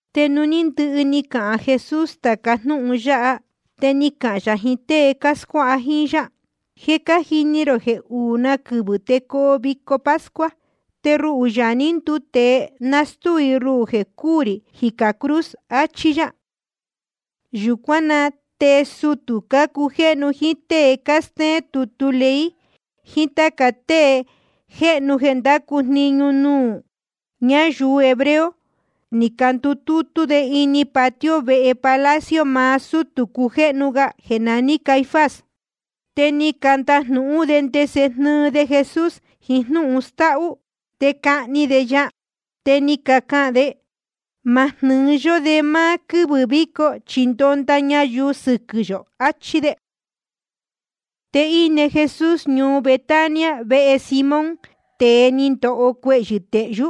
Te nuū ní ndɨhɨ ni cahān Jesús tāca jnúhun yáha, te ni cahān yā jiín tée cáscuáha jíín yá: Je cájini rō jeē uū na quɨvɨ̄ te coo vico pascua. Te ruhū, Yaā ní nduu tēe, nastúu i ruhū jeē cúū rī jicā cruz, achí yá. Yūcuán na te sutū cácujéhnu, jíín tée cástéén tutu ley, jiín táca tée jéhnu jeē cándacu jniñu nuū ñáyuu hebreo, ni candutútú de ini patio vehe palacio maá sútū cujéhnu ga jeē naní Caifás. Te ni candajnūhún de ndese jnɨɨ de Jesús jiín jnúhun stáhú, te cahni de ya. Te ni cacahān de: Ma jnɨ́ɨ yó de máá quɨ́vɨ̄ víco, chi ndonda ñayuu sɨquɨ̄ yō, achí de. Te íne Jesús ñuu Betania vehe Simón, tēe ni ndoho cuehyɨ̄ stehyú.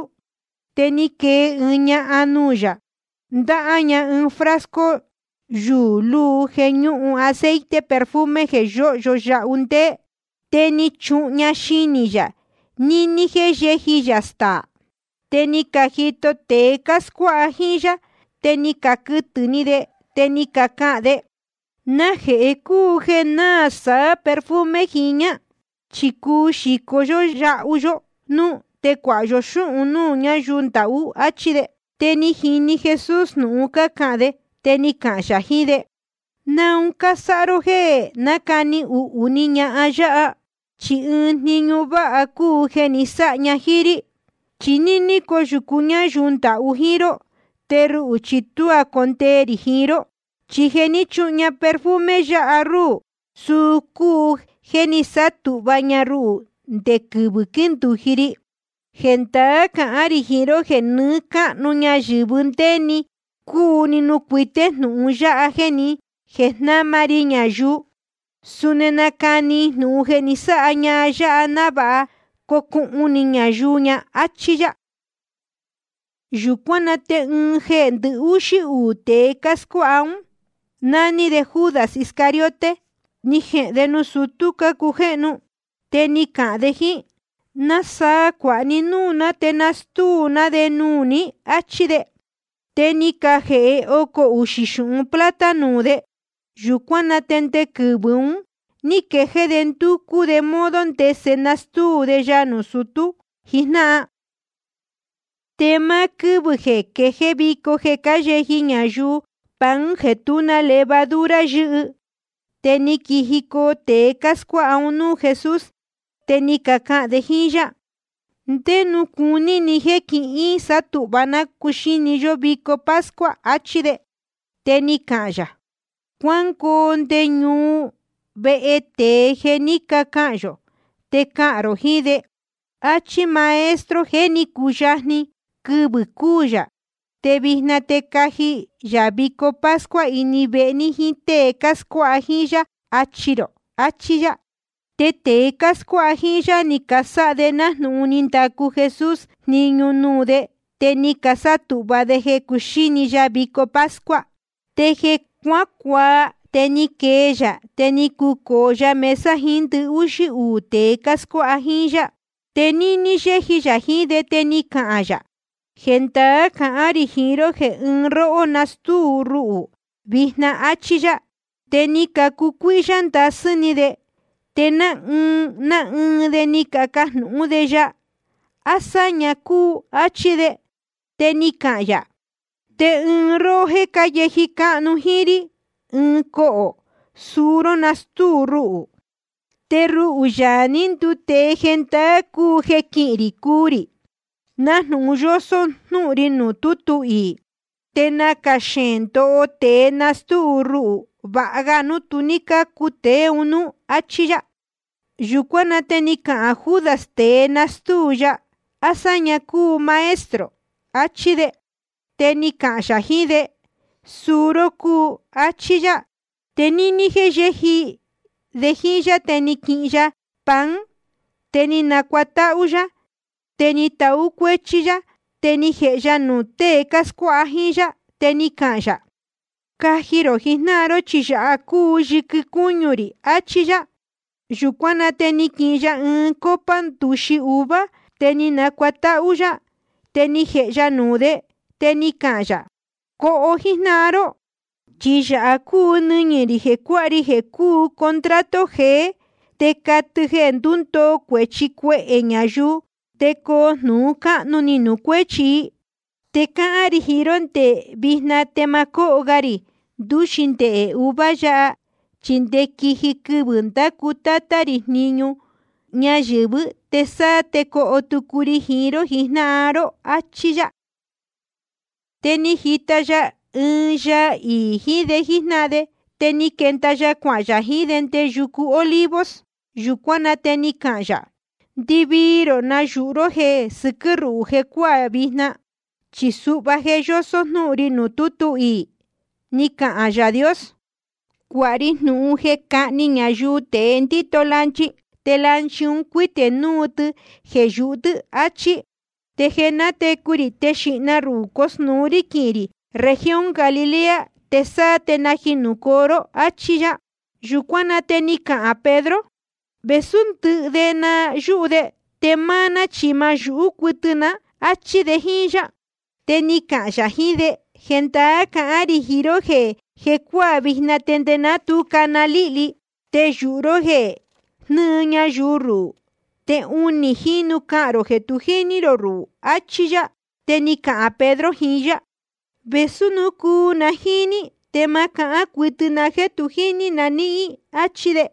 Te ni quee ɨɨn ñahan nuū yā, ndáhá ña ɨɨn frasco yuū luu jeē ñúhun aceite perfume jeē yóhyo yahu ndéé. Te ni chuhun ña xinī yā níní jéē yéji yā staā. Te ni cajito tēe cáscuáha jíín yá, te ni caquɨtɨ̄ ni de, te ni cacahān de: ¿Najehē cúu jeē náā saá‑ni perfume jiñā? Chi cuu xīcó yahu yó núú, te cuāha yo xúhun núū ñáyuu ndahú. Achí de. Te ni jini Jesús jnūhun cácahān de. Te ni cahān yā jiín de: ¿Naun cásáha ró jéē nácani uhū ni ñahan yáha? Chi ɨɨn jniñu váha cúu jeē ni sáha ña jíín rí. Chi níní coyūcu ñáyuu ndahú jíín ró, te ruhū chi tuá condee rī jiín ró. Chi jeē ní chuhun ña perfume yáha ruhū, suu cúu jeē ni sátūhva ña ruhū nde quɨvɨ̄ quíndūji ri. Jendaá cahán rī jiín ró jeē nɨɨ́ cáhnu ñayɨ̄vɨ ndé‑ni cúu nuū cuité jnūhun yáha jéē jnáma ri ñayuu, suni nacani i jnūhun jeē ni sáha ñahan yáha, návāha cocuhun ni ñayuu ña, áchí yá. Yūcuán na te ɨɨn jeē ndɨhúxí uū tēe cáscuáha ún, nání de Judas Iscariote, ni jehēn de nuū sutú cácujéhnu. Te ni cahān de jíín: ¿Nasaa cuāha ní núū ná, te na nástúu ná de nuū ní? áchí de. Te ni cajēhe ocō uxī xūhun plata nuū de. Yūcuán na te nde quɨvɨ̄ un ní quejéé de ndúcú de modo ndese nastúu de ya nuū sutú jijnáhan. Te máá quɨ́vɨ̄ jeē quejéé vico jeē cáyeji ñayuu pan jeē tú na levadura yɨ́hɨ, te ni quijicoo tēe cáscuáha un núū Jesús. Te ni cacahān de jíín yá: ¿Ndé nuū cuní ni jéē quísatūhva ná cuxíni ní vico pascua? áchí de. Te ni cahān yā: Cuángoo nde ñuu, vehe tēe jeē jé ni cacahān yō, te cahān rō jiín de: Achí máá Maestro jeē ní cuyajni quɨvɨ̄ cuu yā. Te vijna te caji yā vico pascua ini vehe ní jíín tée cáscuáha jíín yá, achi rō. Achí yá. Te tēe cáscuáha jíín yá, ni casáha de nájnūhun ni ndacu Jesús jniñu nuū de, te ni casátūhva de jeē cuxíni ya vico pascua. Te jeē cuácuaa, te ni quee yā, te ni cucōo ya mesa jiín ndɨhúxí uū tēe cáscuáha jíín yá. Te níní yéji yā jiín de te ni cahān yā: Jendaá cahán rī jiín ró jeē ɨɨn róhó nastúu ruhū vijna, áchí yá. Te ni cacucuíhyá ndasɨ́ ni de. Te ná ɨɨn ná ɨɨn de ni cacajnūhún de ya: ¿A sáña cúu? áchí de. Te ni cahān yā: Ɨɨn róhó jéē cáyeji cáhnu jíín rí ɨɨn cohō, suu ró nastúu ruhū. Te ruhū, Yaā ní nduu tēe, jendaá cúu jeē quihín rī cuu rī, nájnūhun yósó jnúhun ri nuū tútu iī. Te nacā xeēn ndoho tēe nastúu ruhū. Vāha ga núu tu ní cácu tēe un núú, áchí yá. Yūcuán na te ni cahān Judas, tēe nastúu ya: ¿A sáña cúu, Maestro? achí de. Te ni cahān yā jiín de: Suu ró cúu, áchí yá. Te níní jéē cáyeji de jíín yá, te ni quihin ya pan, te ni nacuatáhú yá, te ni tahú cuéchí yá, te ni jēhe ya nuū tée cáscuáha jíín yá. Te ni cahān yā: Caji rō jijnáhan ró, chi yāha cúu yɨquɨ cúñu rī, achí yá. Yūcuán na te ni quihin ya ɨɨn copa ndūxi uva, te ni nacuatáhú yá, te ni jēhe ya nuū de. Te ni cahān yā: Coho jíjnáhan ró. Chi yāha cúu nɨñɨ̄ rī jeē cuáha ri jeē cúu contrato jeé, te catɨ jeē ndundoo cuēchi cuehē ñayuu, te coo jnūhun cáhnu ni nuū cuéchi i. Te cáhán rī jiín ró jeē ndé vijna te ma cóho ga rī ndūxi ndehē uva yāhá, chi nde quiji quɨvɨ̄ ndacu Tátá rī jniñu nɨ́ɨ́ ñayɨ̄vɨ́, te sáá te coho tucu ri jiín ró jijnáhan ró. Achí yá. Te ni jita ya ɨɨn yaa iī jiín de jíjnáhan de. Te ni quenda ya cuahān yā jiín de nde yucu Olivos. Yūcuán na te ni cahān yā: Ndɨvii rō nayūhu ró jeē sɨquɨ́ ruhū jecuáā vijna. Chi suhva je yósó jnúhun ri nuū tútu iī, ni cahān Yaā Dios: Cuāha ri jnūhun jeē cáhni ñayuu tēe ndíto lanchi, te lanchi un cuítē núu tɨ jeē yūhu tɨ́, achí. Te jeē nátecu rī, te xīhna ruhū cosnūu rí quihīn rī región Galilea, te sáá te najinūcoo ró, áchí yá. Yūcuán na te ni cahān Pedro: Vēsú ndɨhɨ de na náyūhú de, te máá ná chi ma náyūhú cuɨtɨ ná, áchí de jíín yá. Te ni cahān yā jiín de: Jendaá cahán rī jiín ró jeē jecuáā vijna, nde ná tu cana líhli, te yūhu ró jeē jnɨɨ ñayuu rohó, te unī jínu cahān rō jeē tu jíní rō ruhū, achí yá. Te ni cahān Pedro jiín yá: Vēsú núu cuu na jíín ní, te ma cahán cuɨtɨ na jéē tu jíní na níhín, áchí de.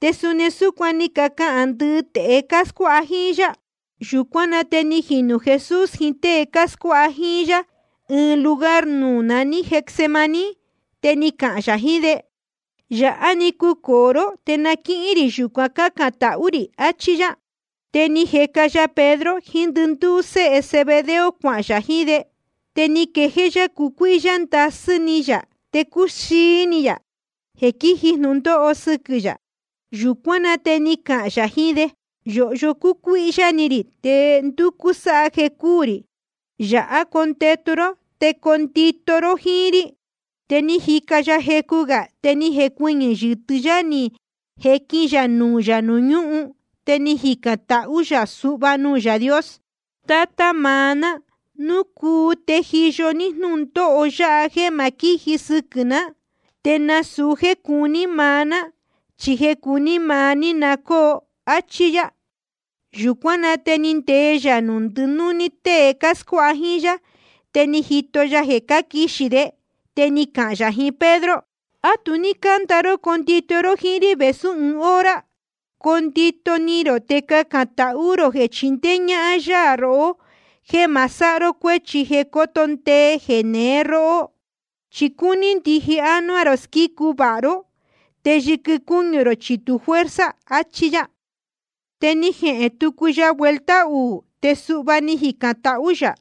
Te suni súcuan ni cacahān ndɨhɨ tēe cáscuáha jíín yá. Yūcuán na te ni jinū Jesús jiín tée cáscuáha jíín yá ɨɨn lugar nuū naní Getsemaní. Te ni cahān yā jiín de: Yāhá‑ni cucōo ró, te na quíhín rī yūcuan cácān tahú rī, achí yá. Te ni jeca ya Pedro jiín ndɨndúú séhe Zebedeo cuahān yā jiín de. Te ni quejéé yá cucuíhyá ndasɨ́ ni yā te cúxií ni yā jeē quíji jnūndóho sɨquɨ̄ yā. Yūcuán na te ni cahān yā jiín de: Yōhyo cúcuíhyá ni rī, te ndúcú sáha jeē cúū rī. Yāhá condetu ró te condito ró jíín rí. Te ni jica ya jecu gā, te ni jecuɨñɨ̄ yɨtɨ́ yá ni jequin ya nuū yā nuū ñúhun, te ni jicān tahú yā suhva nuū Yaā Dios: Tátá maá ná, núu cuu te tejiyo ní jnúndóho yáha jéē ma quíji sɨquɨ̄ ná. Te nasūu jéē cuní maá ná, chi jeē cuní maá ní na cóo, áchí yá. Yūcuán na te ni ndee yā nuū ndɨnúní tée cáscuáha jíín yá, te ni jito ya jeē cáquixī de. Te ni cahān yā jiín Pedro: ¿A tu ní cánda ró condito ró jíín rí vēsú ɨɨn hora? Coo ndito ni rō te cacān tahú rō jeē chindéé ñáhán yá rohó jéē ma sáha ró cuéchi jeē coto ndee jeneé róhó. Chi cúní ndije ánuá rō squícu vāha ró, te yɨquɨ cúñu rō chi tu fuerza, achí yá. Te ni jehēn tucu ya vuelta uū, te suhva ni jicān tahú yā: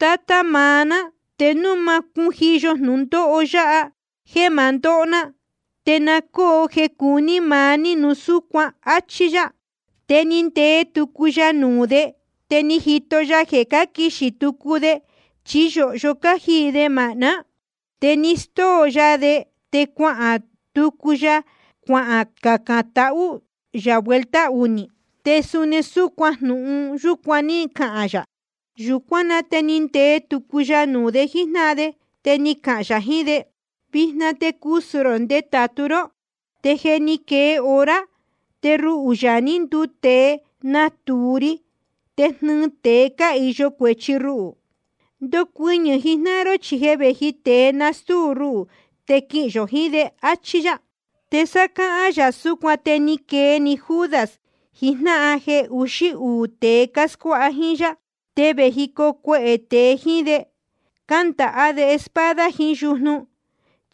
Tátá maá ná, te núu ma cúu cujiyo jnūndóho yáha jeē ma ndóho ná, te na cóo jeē cuní maá ní núu súcuan, áchí yá. Te ni ndee tucu ya nuū de, te ni jito ya jeē cáquixī tucu de, chi yōhyo cájiī de māhná. Te ni stóo ya de, te cuahān tucu ya cuacacān tahú yā vuelta unī. Te suni jnūhun yúcuan ní cahān yā. Yūcuán na te ni ndee tucu ya nuū de jíjnáhan de, te ni cahān yā jiín de: Vijna te cusū rō te ndetātu ró. Te je ni quee hora, te ruhū, Yaā ní nduu tēe, natūu ri te jnɨɨ tēe cáhīyo cuēchi ruhū. Ndocuɨñɨ̄ jijnáhan ró, chi je vēji tēe nastúu ruhū, te quihīn yō jiín de, áchí yá. Te sá cáhán gā yā súcuan, te ni quee‑ni Judas, ɨɨn jnáhan jeē uxí uū tēe cáscuáha jíín yá. Te vējicoo cuehē tēe jíín de, cándaha de espada jiín yujnu.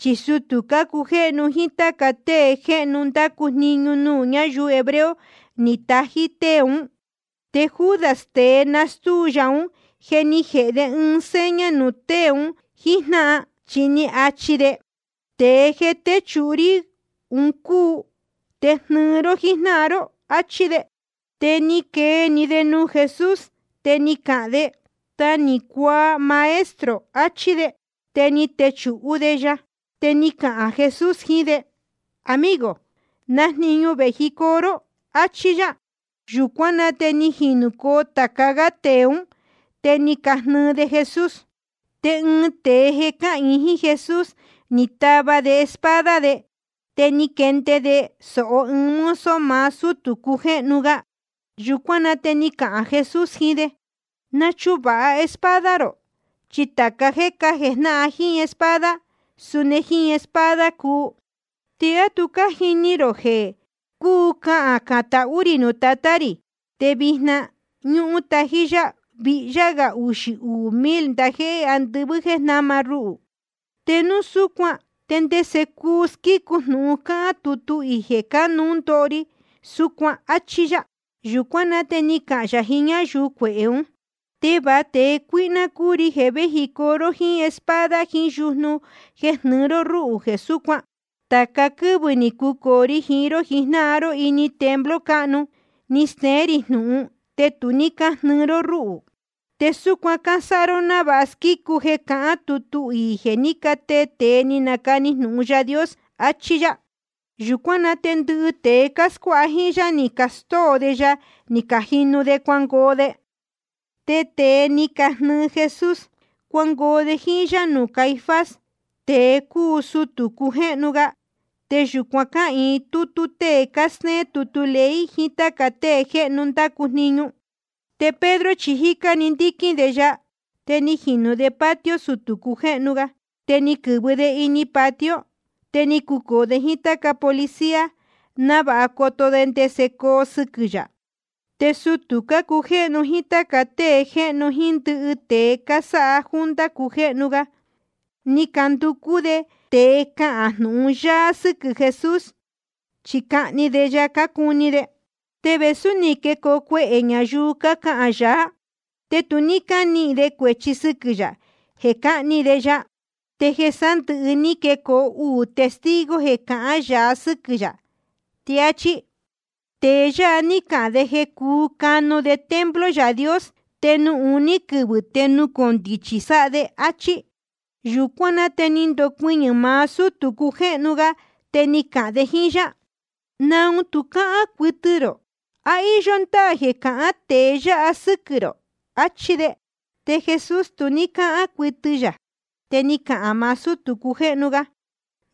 Chi sutū cácujéhnu jíín táca tée jéhnu cándacu jniñu nuū ñáyuu hebreo, ni catají tée ún. Te Judas, tēe nástúu ya ún, je ni jēhe de ɨɨn seña nuū tée un jíjnáhan, chi ni achi de: Tēe jeē téchūhu rí un cúu. Te jnɨɨ ró jíjnáhan ró, áchí de. Te ni quee‑ni de nuū Jesús, te ni cahān de: Ta ni cuaa, Maestro, achí de. Te ni techūhú de ya. Te ni cahān Jesús jiín de: Amigo, ¿na jniñu vēji ró? áchí yá. Yūcuán na te ni jinūcoo tāca gá tēe ún, te ni cajnɨɨ de Jesús. Te ɨɨn tēe jeē cáhīin jíín Jesús, ni tava de espada de, te ni jehnde de sōho ɨɨn mozo maá sútū cujéhnu ga. Yūcuán na te ni cahān Jesús jiín de: Nachuvāha espada rō, chi tāca jéē cájejnáhan jíín espada, suni jíín espada cuu. ¿Te á tu cájini rō jeē cuu cacān tahú rī nuū Tatá rī, te vijna ñúhún tají yá víhyá gā uxī uū mil ndajéhé andɨvɨ́ jeē jnama ruhū? Te núu súcuan, ¿te ndese cuu squícu jnūhun cáhán tutu iī jeē cánuú ndoho ri súcuan? áchí yá. Yūcuán na te ni cahān yā jiín ñáyuu cuehē ún: ¿Te va tēe cuíhná cúu ri jeē véjicoo ró jíín espada jiín yujnu jeē jnɨɨ ró rúhū jeē súcuan. Tāca quɨ́vɨ̄ ni cucōo ri jiín ró jijnáhan ró ini templo cáhnu, ni steén rī jnūhun, te tu ní cájnɨɨ ró rúhū. Te súcuan cásáha ró návāha na squícu jeē cahán tutu iī jeē ní catee tēe ni canacani jnūhun Yaā Dios, achí yá. Yūcuán na te ndɨhɨ tēe cáscuáha jíín yá, ni castóo de ya, ni cajinu de cuangoo de. Te tēe ni cajnɨɨ Jesús, cuangoo de jíín yá nuū Caifás, tēe cúu sutū cujéhnu ga. Te yūcuan cáhīin tútú tée cástéén tutu ley jiín táca tée jéhnu cándacu jniñu. Te Pedro chi jícá‑ni ndíquín de ya, te ni jinū de patio sutū cujéhnu ga. Te ni quɨ̄vɨ de ini patio, te ni cucōo de jíín táca policía, návāha coto de ndese coo sɨquɨ̄ yā. Te sutū cácujéhnu jíín táca tée jéhnu jíín ndɨhɨ tēe cásáha junta cujéhnu ga, ni canducú de tēe cahān jnūhun yáá sɨ́quɨ̄ Jesús, chi cahni de ya cácuni de. Te vēsú ni quecoo cuehē ñayuu cácahān yaá, te tu ní cánihīn de cuēchi sɨquɨ̄ yā jeē cáhni de ya. Te jeē sándɨ̄hɨ́ te ni quecoo uū testigo jeē cahán yaá sɨ́quɨ̄ yā. Te áchí: Tēe yáha ní cahān de jeē cuu canu de templo Yaā Dios, te nuū uní‑ni quɨvɨ̄ te nucondichi sáha de, áchí. Yūcuán na te ni ndocuɨñɨ̄ maá sútū cujéhnu ga, te ni cahān de jíín yá: ¿Naun tu cáhán cuɨtɨ rō? ¿A íyó ndáā jeē cácahān tēe yáha sɨ́quɨ̄ rō? Achí de. Te Jesús tu ní cáhán cuɨtɨ yā. Te ni cahān maá sútū cujéhnu ga: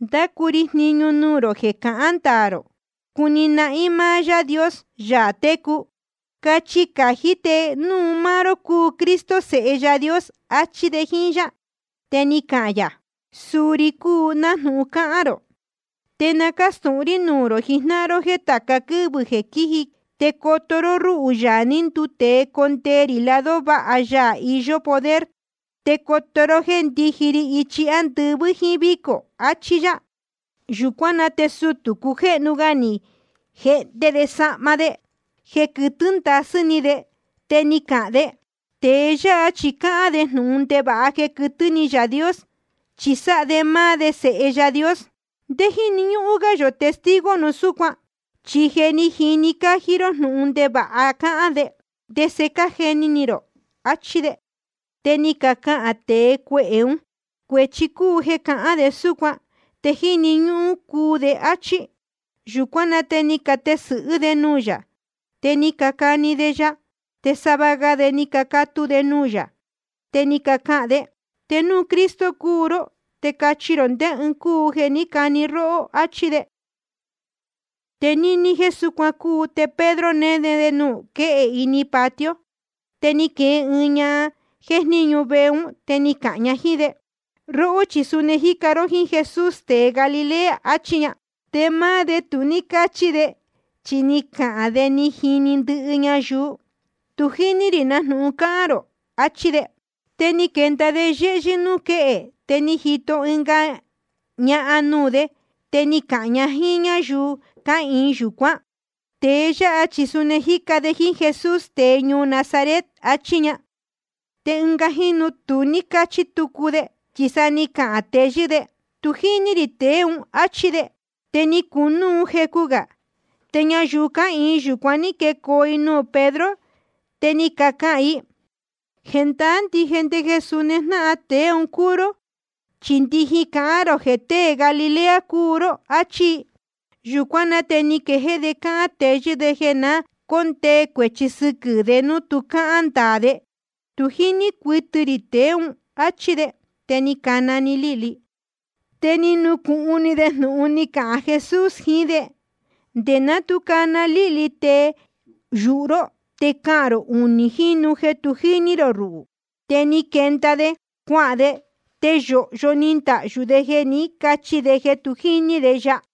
Ndácu ri jniñu nuū rō jeē cahān ndaā rō cuni nahín maá Yaā Dios, Yaā técu. Cachi cají te núu máá ró cúu Cristo, Sēhe Yaā Dios, achí de jíín yá. Te ni cahān yā: Suu ri cúu, nájnūhun cáhán rō. Te na cástūhun rí nuū rō jijnáhan ró jéē tāca quɨ́vɨ jeē quíji te coto ró rúhū, Yaā ní nduu tēe, condee rī lado váha Yaā iyó poder. Te coto ró jéē ndíji ri ichi ándɨvɨ́ jíín vícō. Achí yá. Yūcuán na te sutū cujéhnu ga ni jehnde de sahma de jeē quɨtɨ́ ndasɨ́ ni de, te ni cahān de: Tēe yáha chi cáhán de jnūhun ndevāha jeē quɨtɨ́ ni Yaā Dios, chi sáha de máá de Sēhe Yaā Dios. ¿Ndé jíni ñúhún gá yō testigo núu súcuan? Chi je ni cajini ró jnúhun ndevāha cáhán de. ¿Te ndese cájeni ni rō? achí de. Te ni cacahān tēe cuehē ún: Cuēchi cúu jeē cahán de súcuan, te jíni ñúhún cuu de, áchí. Yūcuán na te ni catesɨ̄hɨ́ de nuū yā, te ni cacani de ya. Te sava ga de ni cacatu de nuū yā. Te ni cacahān de: Te núu Cristo cúu ró, te cachi rō ndé ɨɨn cúu jeē ní cani róhó, áchí de. Te níní jéē súcuan cúu, te Pedro néne de nuū quéhe ini patio. Te ni quee ɨɨn ñahan jéjníñu vehe ún, te ni cahān ña jíín de: Róhó chi suni ni jica ró jíín Jesús tēe Galilea, achí ña. Te máá de tu ní cáchi de, chi ni cahān de ni cajini ndɨhɨ ñayuu: Tu jíní rī na jnūhun cáhán rō, achí de. Te ni quenda de yéhyɨ́ núū quéhe, te ni jito ɨnga ñahan nuū de. Te ni cahān ña jíín ñáyuu cáhīin yūcuán: Tēe yáha chi suni ni jica de jíín Jesús, tēe ñuu Nazaret, achí ña. Te ɨnga jínu tu ní cáchi tucu de, chi sa ni cahān teyɨ́ de: Tu jíní rī tēe ún, áchí de. Te ni cunúu jecu gā, te ñayuu cáhīin yūcuan ní quecoo i nuū Pedro, te ni cacahān i: Jendaá ndije jeē suni jnáhan tēe un cúu ró, chi ndijin cahán rō jeē tée Galilea cúu ró, áchí i. Yūcuán na te ni quejéé de cáhán teyɨ́ de jeē na cóndee cuēchi sɨquɨ̄ de núu tu cáhán ndaā de: Tu jíní cuɨtɨ rī tēe ún, áchí de. Te ni cana‑ni líhli. Te ni nucūhun ni de jnūhun ni cahān Jesús jiín de: Nde ná tu cana líhli, te yūhu ró te cahān rō unī jínu jeē tu jíní rō ruhū. Te ni quenda de cuahān de, te yōhyo ni ndahyū de jeē ní cachi de jeē tu jíní de ya.